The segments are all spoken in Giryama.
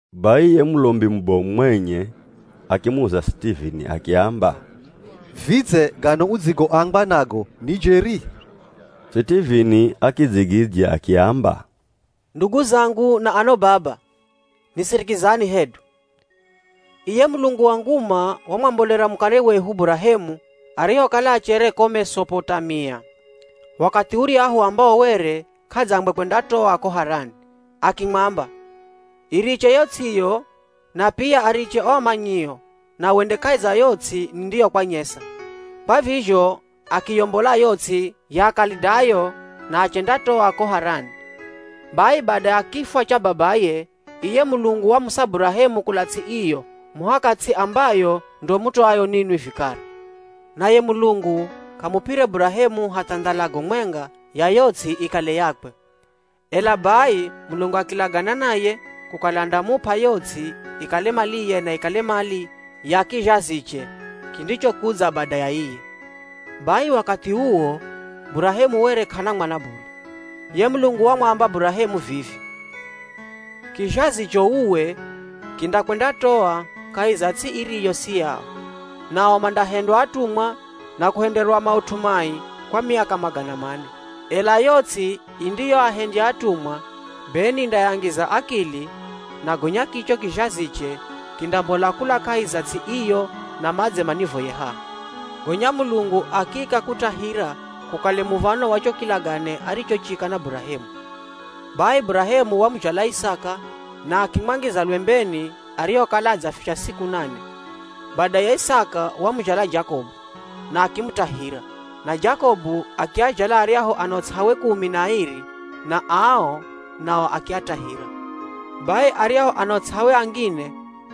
Bai ye Mulombi mubomu mwenye akimuza Sitivini akiamba, “Vidze gano udzigoambwa nago ni jeri?” Sitivini akidzigidzya akiamba, “Ndugu zangu na ano baba, nisirikizani hedu! Iye Mulungu wa nguma wamwambolera mukare wehu Burahemu arihokala achere ko Mesopotamia, wakathi uryahu ambawo were k'adzangwe kwendatoa ko Harani. Akimwamba, ‘Iriche yo ts'iyo na pia ariche o amanyio na wende kahi za yo ts'i nindiyokwanyesa.’ Kwa vizho akiyombola yo ts'i ya Akalidayo na achendatoa ko Harani. Bai bada ya kifwa cha babaye, iye Mulungu wamusa Burahemu kula ts'i iyo muhaka ts'i ambayo ndo mutoayo ninwi vikara. Naye Mulungu k'amup'ire Burahemu hatha ndhalago mwenga ya yo ts'i ikale yakwe. Ela bai Mulungu akilagana naye kukala andamup'a yo ts'i ikale maliye na ikale mali ya kizhaziche kindichokudza bada ya iye. Bai wakathi uwo Burahemu were k'ana mwana bule. Ye Mulungu wamwamba Burahemu vivi, ‘Kizhazicho uwe kindakwendatoa kahi za ts'i iriyo si yao nao mandahendywa atumwa na kuhenderwa maut'u mai kwa miaka magana mane. Ela yo ts'i indiyoahendya atumwa be nindayangiza akili na gonya kicho kizhaziche kindambola kula kahi za ts'i iyo na madze manivoye haha.’ Gonya Mulungu akiika kutahira kukale muv̱ano wa cho kilagane arichochika na Burahemu. Bai Burahemu wamuzhala Isaka na akimwangiza lwembeni arihokala adzafisha siku nane. Badaye Isaka wamuzhala Jakobu na akimutahira, na Jakobu akiazhala aryahu ano ts'awe kumi na airi na ao nao akiatahira. “Bai aryahu ano ts'awe angine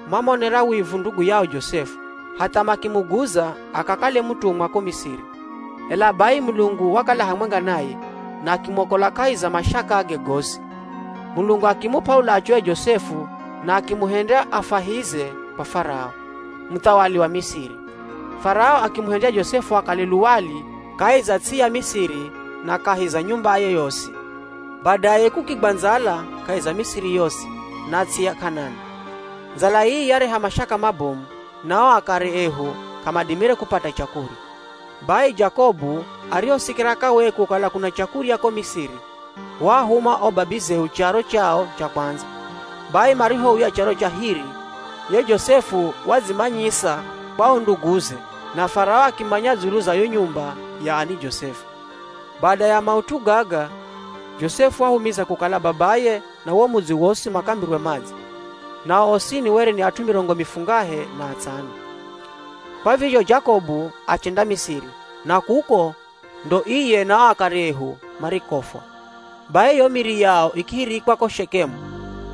mamuonera wivu ndugu yao Josefu hatha makimuguza akakale mutumwa ko Misiri. Ela bai Mulungu wakala hamwenga naye na akimwokola kahi za mashakage gosi. Mulungu akimup'a ulachu ye Josefu na akimuhendya afwahize kwa Farao, Muthawali wa Misiri. Farao akimuhendya Josefu akale luwali kahi za ts'i ya Misiri na kahi za nyumbaye yosi. “Badaye kukigwa ndzala kahi za Misiri yosi na ts'i ya K'anani. Ndzala ii yareha mashaka mabomu na o akare ehu k'amadimire kupata chakurya. Bai Jakobu arihosikira kawee kukala kuna chakurya ko Misiri, waahuma o babizehu charo chao cha kwandza. Bai marihouya charo cha hiri, ye Josefu wadzimanyisa kwa o nduguze na Farao akimanya dzulu za yo nyumba ya ani Josefu. Bada ya maut'u gaga Josefu wahumiza kukala babaye na wo mudzi wosi makambirwe madze. Nao osini were ni at'u mirongo mifungahe na atsano. Kwa vizho Jakobu achenda Misiri, na kuko ndo iye na o akare ehu marikofwa. Bai iyo miri yao ikihirikwa ko Shekemu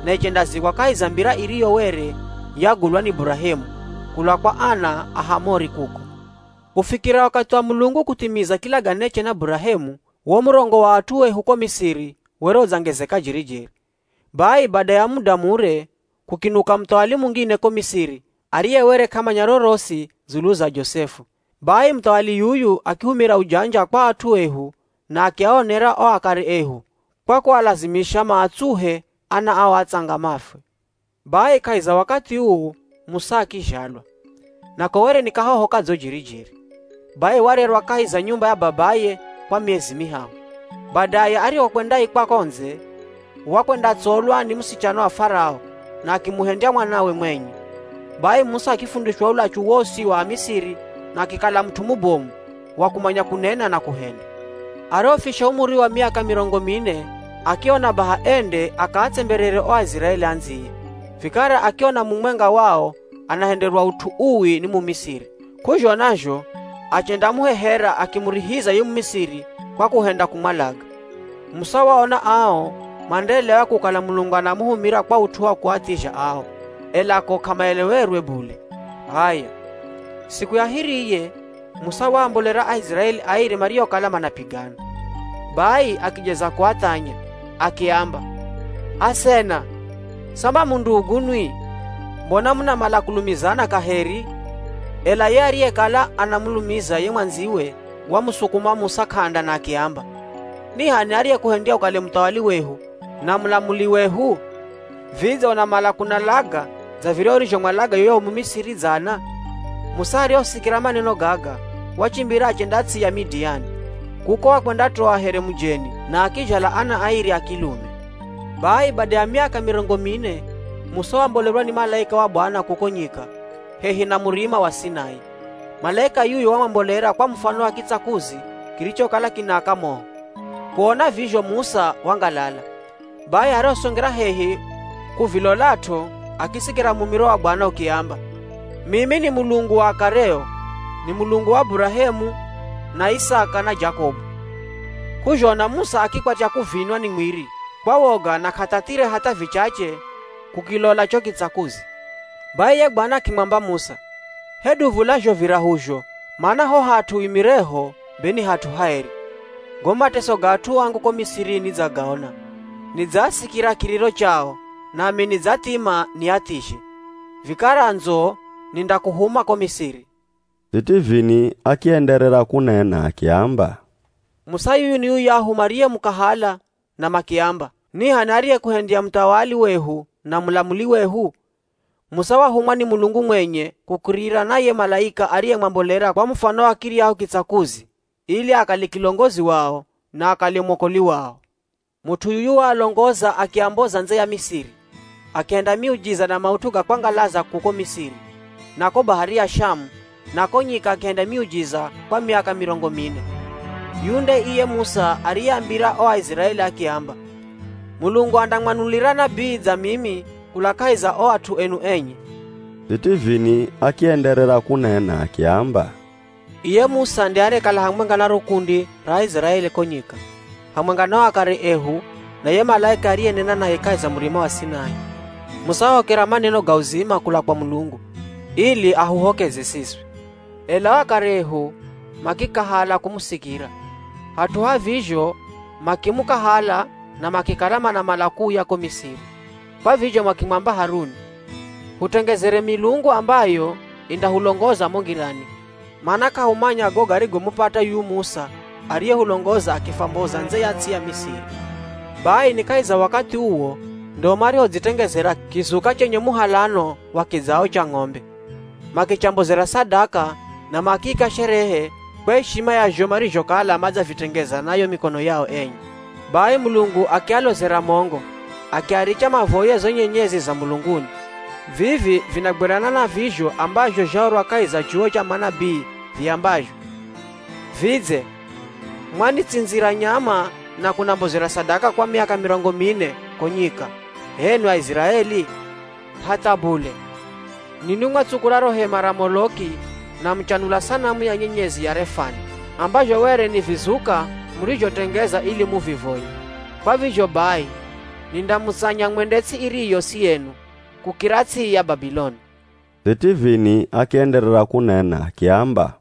na ichendazikwa kahi za mbira iriyo were yagulwa ni Burahemu kula kwa ana a Hamori kuko. “Kufikira wakathi wa Mulungu kuthimiza kilaganeche na Burahemu, wo murongo wa at'u ehu ko Misiri were udzangezeka jeri-jeri. Bai bada ya muda mure, kukinuka muthawali mungine ko Misiri ariye were k'amanya rorosi dzulu za Josefu. Bai muthawali yuyu akihumira ujanja kwa at'u ehu na akiaonera o akare ehu kwa kualazimisha maatsuhe ana ao atsanga mafwe. “Bai kahi za wakathi uu Musa akizhalwa, nako were ni kahoho kadzo jeri-jeri. Bai warerwa kahi za nyumba ya babaye kwa miezi mihahu. Badaye arihokwendaikwa ko ndze, wakwendatsolwa ni musichana wa Farao na akimuhendya mwanawe mwenye. Bai Musa akifundishwa ulachu wosi wa Amisiri na akikala mut'u mubomu wa kumanya kunena na kuhenda. “Arihofisha umuri wa miaka mirongo mine akiona baha ende akaatsemberere o Aiziraeli andziye. Vikara akiona mumwenga wao anahenderwa ut'u uwi ni Mumisiri, k'uzhona zho achendamuhehera, akimurihiza ye Mumisiri kwa kuhenda kumwalaga. (Musa waona ao mandaelewa kukala Mulungu anamuhumira kwa ut'u wa kuathizha ao, ela ko k'amaelewerwe bule.) H'aya, siku ya hiriye Musa waambolera Aiziraeli airi mariokala manapigana. Bai akijeza kuathanya. Akiamba, ‘Asena, samba mu ndugu nwi? Mbona munamala kulumizana kaheri?’ Ela ye ariyekala anamulumiza ye mwandziwe wamusukuma Musa k'anda na akiamba, ‘Ni h'ani ariyekuhendya ukale muthawali wehu na mulamuli wehu? Vidze unamala kunalaga dza viryahu urizhomwalaga yuyahu Mumisiri dzana?’ Musa arihosikira maneno gaga, wachimbira achenda ts'i ya Midiani. Kuko wakwendatoa here mujeni na akizhala ana airi a kilume. “Bai bada ya miaka mirongo mine, Musa wambolerwa ni malaika wa Bwana kuko nyika hehi na Murima wa Sinai. Malaika yuyu wamwambolera kwa mufano wa kitsakuzi kirichokala kinaaka moho. Kuona vizho Musa wangalala. Bai arihosongera hehi kuvilolat'o, akisikira mumiro wa Bwana ukiamba, ‘Mimi ni Mulungu wa akareo, ni Mulungu wa Burahemu, na Isaka, na Jakobu.’ K'uzhona Musa akikwatya kuvinwa ni mwiri kwa woga na k'athathire hatha vichache kukilola cho kitsakuzi. “Bai ye Bwana akimwamba Musa, ‘Hedu vula zho virahuzho, mana ho hat'u uimireho be ni hat'u haeri. Go mateso ga at'u angu ko Misiri nidzagaona. Nidzaasikira kiriro chao nami nidzathima, niathizhe. Vikara ndzo, nindakuhuma ko Misiri.’” Sitivini akienderera kunena akiamba, “Musa yuyu ni yuyahu mariyemukahala, na makiamba, ‘Ni h'ani ariyekuhendya muthawali wehu na mulamuli wehu?’ Musa wahumwa ni Mulungu mwenye kukirira na ye malaika ariyemwambolera kwa mufano wa kiryahu kitsakuzi, ili akale kilongozi wao na akale mwokoli wao. Mut'u yuyu waalongoza akiamboza ndze ya Misiri, akihenda miujiza na maut'u ga kwangalaza kuko Misiri, na ko Bahari ya Shamu na ko nyika akihenda miujiza kwa miaka mirongo mine. Yuyu nde iye Musa ariyeambira o Aiziraeli akiamba, ‘Mulungu andamwanulira nabii dza mimi kula kahi za o at'u enu enye.’” Sitivini akienderera kunena akiamba, “Iye Musa nde ariyekala hamwenga na ro kundi ra Aiziraeli ko nyika, hamwenga na o akare ehu na ye malaika ariyenena naye kahi za Murima wa Sinai. Musa wahokera maneno ga uzima kula kwa Mulungu ili ahuhokeze siswi. “Ela o akare ehu makikahala kumusikira, hat'u ha vizho makimukahala na makikala manamala kuuya ko Misiri. Kwa vizho makimwamba Haruni, ‘Hutengezere milungu ambayo indahulongoza mo ngirani, mana k'ahumanya go garigomupata yuyu Musa ariyehulongoza akifwamboza ndze ya ts'i ya Misiri!’ “Bai ni kahi za wakathi uwo ndo marihodzitengezera kizuka chenye muhalano wa kidzao cha ng'ombe. Makichambozera sadaka na makiika sherehe kwa ishima ya zho marizhokala madzavitengeza na yo mikono yao enye. Bai Mulungu akialozera mongo, akiaricha mavoye zo nyenyezi za mulunguni. Vivi vinagwirana na vizho ambazho zhaorwa kahi za chuwo cha manabii viambazho, ‘Vidze mwanitsindzira nyama na kunambozera sadaka kwa miaka mirongo mine ko nyika, h'enwi Aiziraeli? Hatha bule, ninwi mwatsukula ro hema ra Moloki na muchanula sanamu ya nyenyezi ya Refani, ambazho were ni vizuka murizhotengeza ili muvivoye. Kwa vizho bai nindamutsanya mwende ts'i iriyo si yenu kukira ts'i ya Babiloni.’” Sitivini akienderera kunena akiamba,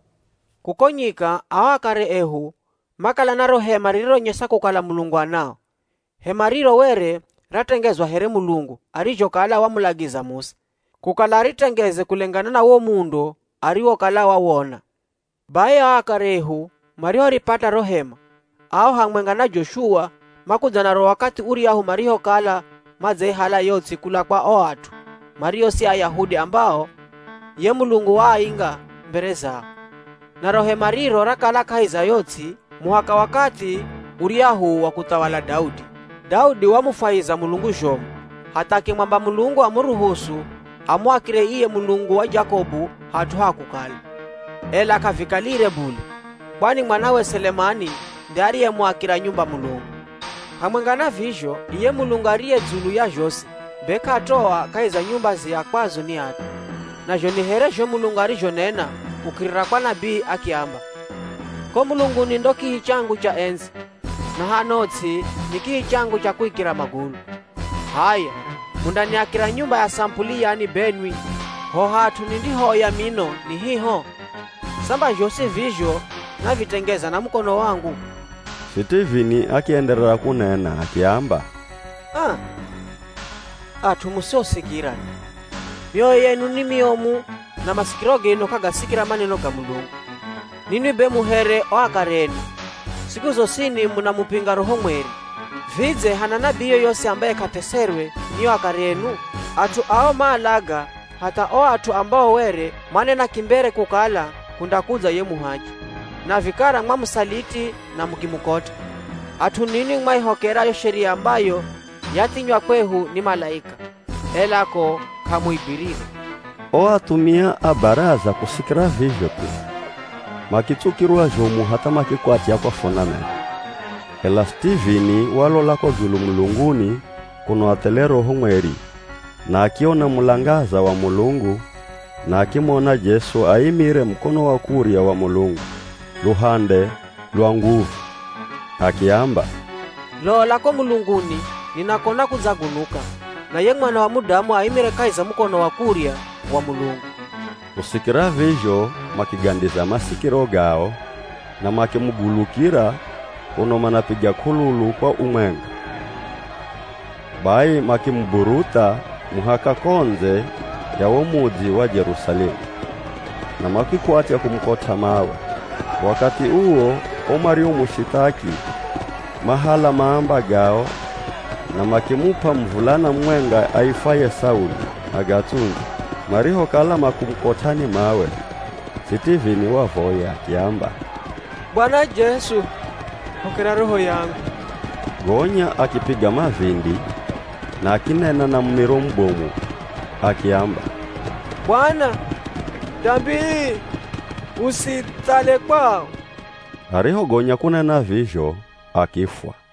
“Kuko nyika ao akare ehu makala na ro hema rironyesa kukala Mulungu anao. Hema riro were ratengezwa here Mulungu arizhokala wamulagiza Musa, kukala aritengeze kulengana na wo muundo ariwokala wawona. Bai ao akare ehu marihoripata ro hema, ao hamwenga na Joshua makudza naro wakathi uryahu marihokala madzaihala yo ts'i kula kwa o at'u mario si Ayahudi ambao ye Mulungu waainga mbere zao. Naro hema riro rakala kahi za yo ts'i muhaka wakathi uryahu wa kuthawala Daudi. Daudi wamufwahiza Mulungu zhomu hatha akimwamba Mulungu amuruhusu amuakire iye Mulungu wa Jakobu hat'u ha kukala. Ela k'avikalire bule, kwani mwanawe Selemani nde ariyemuakira nyumba Mulungu. “Hamwenga na vizho iye Mulungu ariye dzulu ya zhosi be k'atoa kahi za nyumba ziakwazo ni at'u. Nazho ni here zho Mulungu arizhonena kukirira kwa nabii akiamba, ‘Ko mulunguni ndo kihi changu cha endzi, na hano ts'i ni kihi changu cha kuikira magulu. H'aya mundaniakira nyumba ya samupuli yani benwi? Ho hat'u nindihooya mino ni hiho? Samba zhosi vizho navitengeza na mukono wangu?’” Sitivini akienderera kunena akiamba, “Aa! At'u musiosikira nwi, mioyo yenu ni miomu na masikiro genu k'agasikira maneno ga Mulungu! Ninwi be mu here o akare enu, siku zosini munamupinga Roho Mweri! Vidze hana nabii yoyosi ambaye k'ateserwe ni o akare enu? At'u ao maalaga hatha o at'u ambao were manena kimbere kukala kundakudza ye Muhachi. Na vikara mwamusaliti na mukimukot'a. At'u ninwi mwaihokera yo Sheria ambayo yathinywa kwehu ni malaika, ela ko k'amuigwirire.” O athumia a Baraza kusikira vizho thu, makitsukirwa zhomu hatha makikwatya kwafuna meno. Ela Sitivini walola ko dzulu mulunguni kuno athele Roho Mweri, na akiona mulangaza wa Mulungu na akimona Jesu aimire mukono wa kurya wa Mulungu, luhande lwa nguvu. Akiamba, “Lola ko mulunguni ninakona kudzagunuka na ye Mwana wa Mudamu aimire kahi za mukono wa kurya wa Mulungu!” Kusikira vizho makigandiza masikiro gao na makimugulukira kuno manapiga k'ululu kwa umwenga. Bai makimuburutha muhaka ko ndze ya wo mudzi wa Jerusalemu na makikwatya kumukot'a mawe. Wakathi uwo o mariomushithaki mahala maamba gao na makimup'a muvulana mumwenga aifwaye Sauli agatsundze. Marihokala makumukot'ani mawe, Sitivini wavoya akiamba, “Bwana Jesu hokera roho rangu.” Gonya akipiga mavindi na akinena na mumiro mubomu akiamba, “Bwana, dambi ii usiithale kwao.” Arihogonya kunena vizho akifwa.